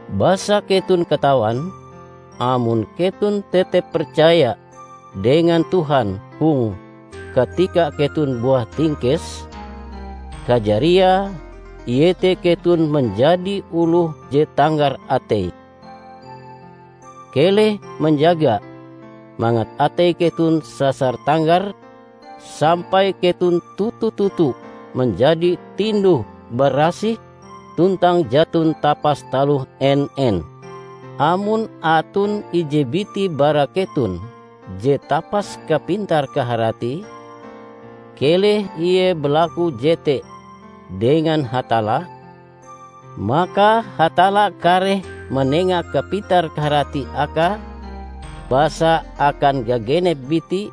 Basa keton katawan, amon keton tetep percaya dengan Tuhan hong katika keton buah tingkes, kajariae iete: keton manjadi oloh je tanggar atei. Keleh manjaga mangat atei keton sasar tanggar sampai keton toto-toto manjadi tinduh-barasih tuntang jaton tapas taloh en-en. Amon aton ije biti bara keton je tapas kapintar-kaharatie, keleh ie balaku jete dengan Hatalla, maka Hatalla kareh manenga kapintar-kaharati akae; basa akan gagenep biti,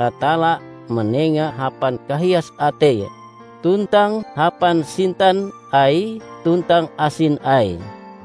Hatalla manenga hapan kahias ateie tuntang hapan sintan Aie tuntang asin Aie.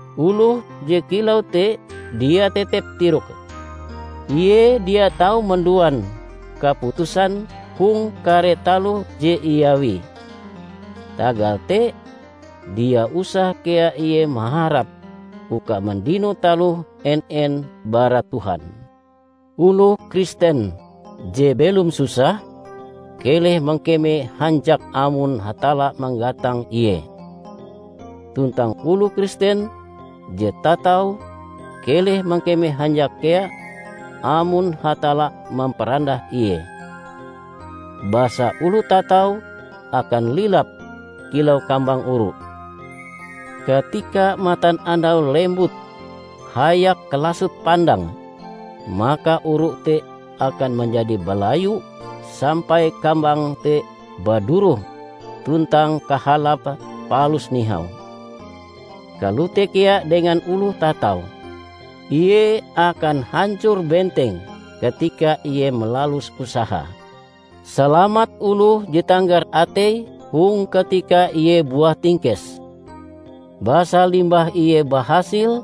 Oloh je kilau te dia tetep tiroke; ie dia tau manduan kaputusan hong kare taloh je iawie. Tagal te, dia usah kea ie maharap uka mandino taloh en-en bara Tuhan. Oloh Kristen je belom susah keleh mangkeme hanjak amon Hatalla manggatang ie. Tuntang oloh Kristen je tatau keleh mangkeme hanjak kea, amon Hatalla mamparandah ie. Basa oloh tatau akan lilap kilau kambang oru. Katika matanandau lembut hayak kalasot pandange, maka oru te akan manjadi balayu sampai kambange te baduroh tuntang kahalape palus nihau. Kalote kea dengan oloh tatau; ie akan hancor benteng katika ie malalus usahae. Salamat oloh je tanggar ateie hong katika ie buah tingkes. Basa limbah ie bahasil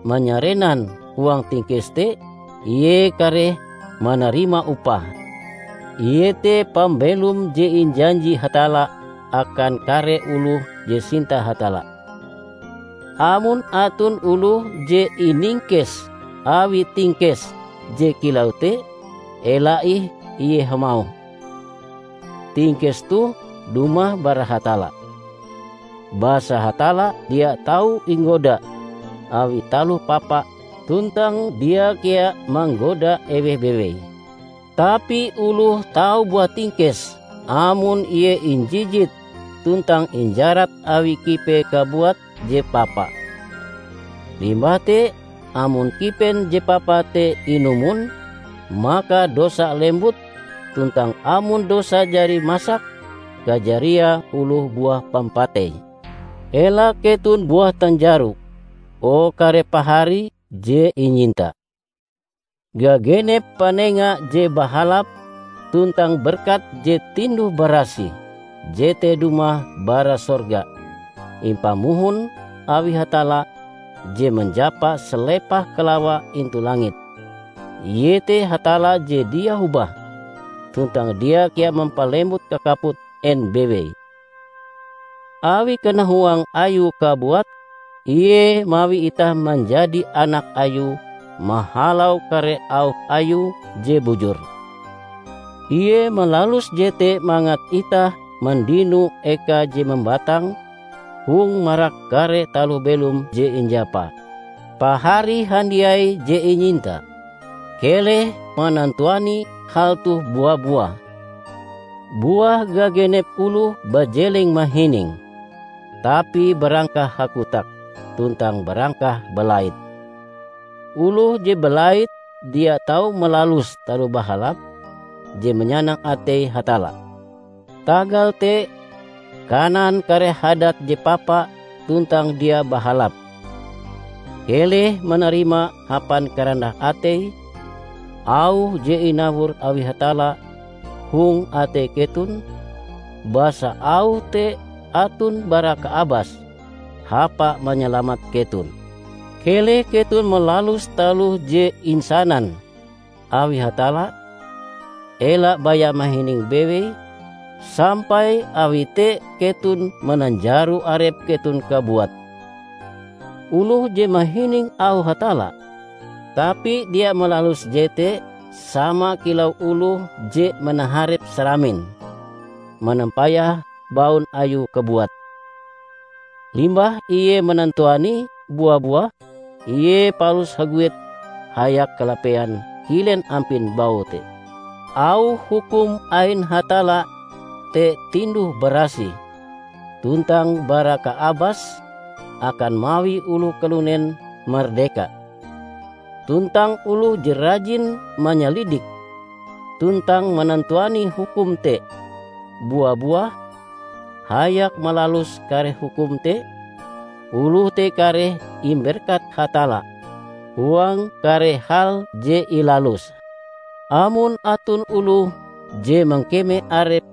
manyarenan huang tingkes te, ie kareh manarima upahe, iete pambelom je injanji Hatalla akan kare oloh je sinta Hatalla. Amon aton oloh je iningkes awi tingkes je kilau te, ela ih ie hamauh, "Tingkes toh dumah bara Hatalla," basa Hatalla dia tau inggoda awi taloh papa tuntang dia kea manggoda eweh bewei. Tapi oloh tau buah tingkes amon ie injijit tuntang injarat awi kipee kabuat je papa. Limbah te, amon kipen je papa te inumon, maka dosa lembut; tuntang amon dosa jari masak, kajariae oloh buah pampatei. Ela keton buah tanjaro, o kare pahari je inyinta! Gagenep panenga je bahalap tuntang berkat je tinduh-barasih jete dumah bara sorga, impamohon awi Hatalla, je manjapa salepah kalawa intu langit. Iete Hatalla je dia hobah, tuntang dia kea mampalembut kakaput en bewei. Awi kanahuang Ayue kabuat Ie mawi itah manjadi anak Ayue mahalau kare auh Ayue je bujur. Ie malalus jete mangat itah mandino eka je mambatang hong marak kare taloh belom je injapae. Pahari handiai je inyinta, keleh manantuani hal toh bua-buah! Buah gagenep oloh bajeleng mahining tapi barangkah hakotak tuntang barangkah balait. Oloh je balait dia tau malalus taloh bahalap je manyanang atei Hatalla. Tagal te, kanan kare hadat je papa tuntang dia bahalap. Keleh manarima hapan karandah atei auh je inawor awi Hatalla hong atei keton, basa auh te aton bara kaabas hapa manyalamat keton. Keleh keton malalus taloh je insanan awi Hatalla, ela baya mahining bewei, sampai awi te keton mananjaro arep keton kabuat. Oloh je mahining auh Hatalla, tapi dia malaluse jete sama kilau oloh je manaharep saramin manampayah baun ayue kabuat. Limbah ie manantuanie bua-buah, ie palus haguet hayak kalapean kilen ampin baue te. Auh hukum ain Hatalla te tinduh-barasih tuntang bara kaabas akan mawi oloh kalunen mardeka. Tuntang oloh je rajin manyalidik tuntang manantuani hukum te bua-buah hayak malalus kare hukum te, oloh te kareh imberkat Hatalla huang kare hal je ilaluse. Amon aton oloh je mangkeme arepe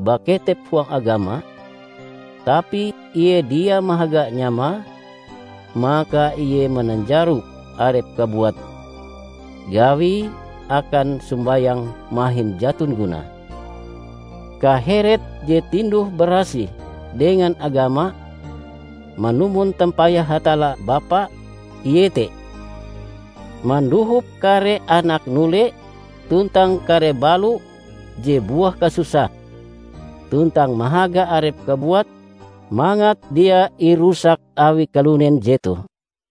baketep huang agama, tapi ie dia mahaga nyamae, maka ie mananjaro arepe kabuat: gawie akan sombayang mahin jaton gunae. Kaheret je tinduh-barasih dengan agama manumon tampayah Hatalla Bapa iete: mandohop kare anak nole tuntang kare balo je buah kasusah, tuntang mahaga arepe kabuat mangat dia irusak awi kalunen jetoh.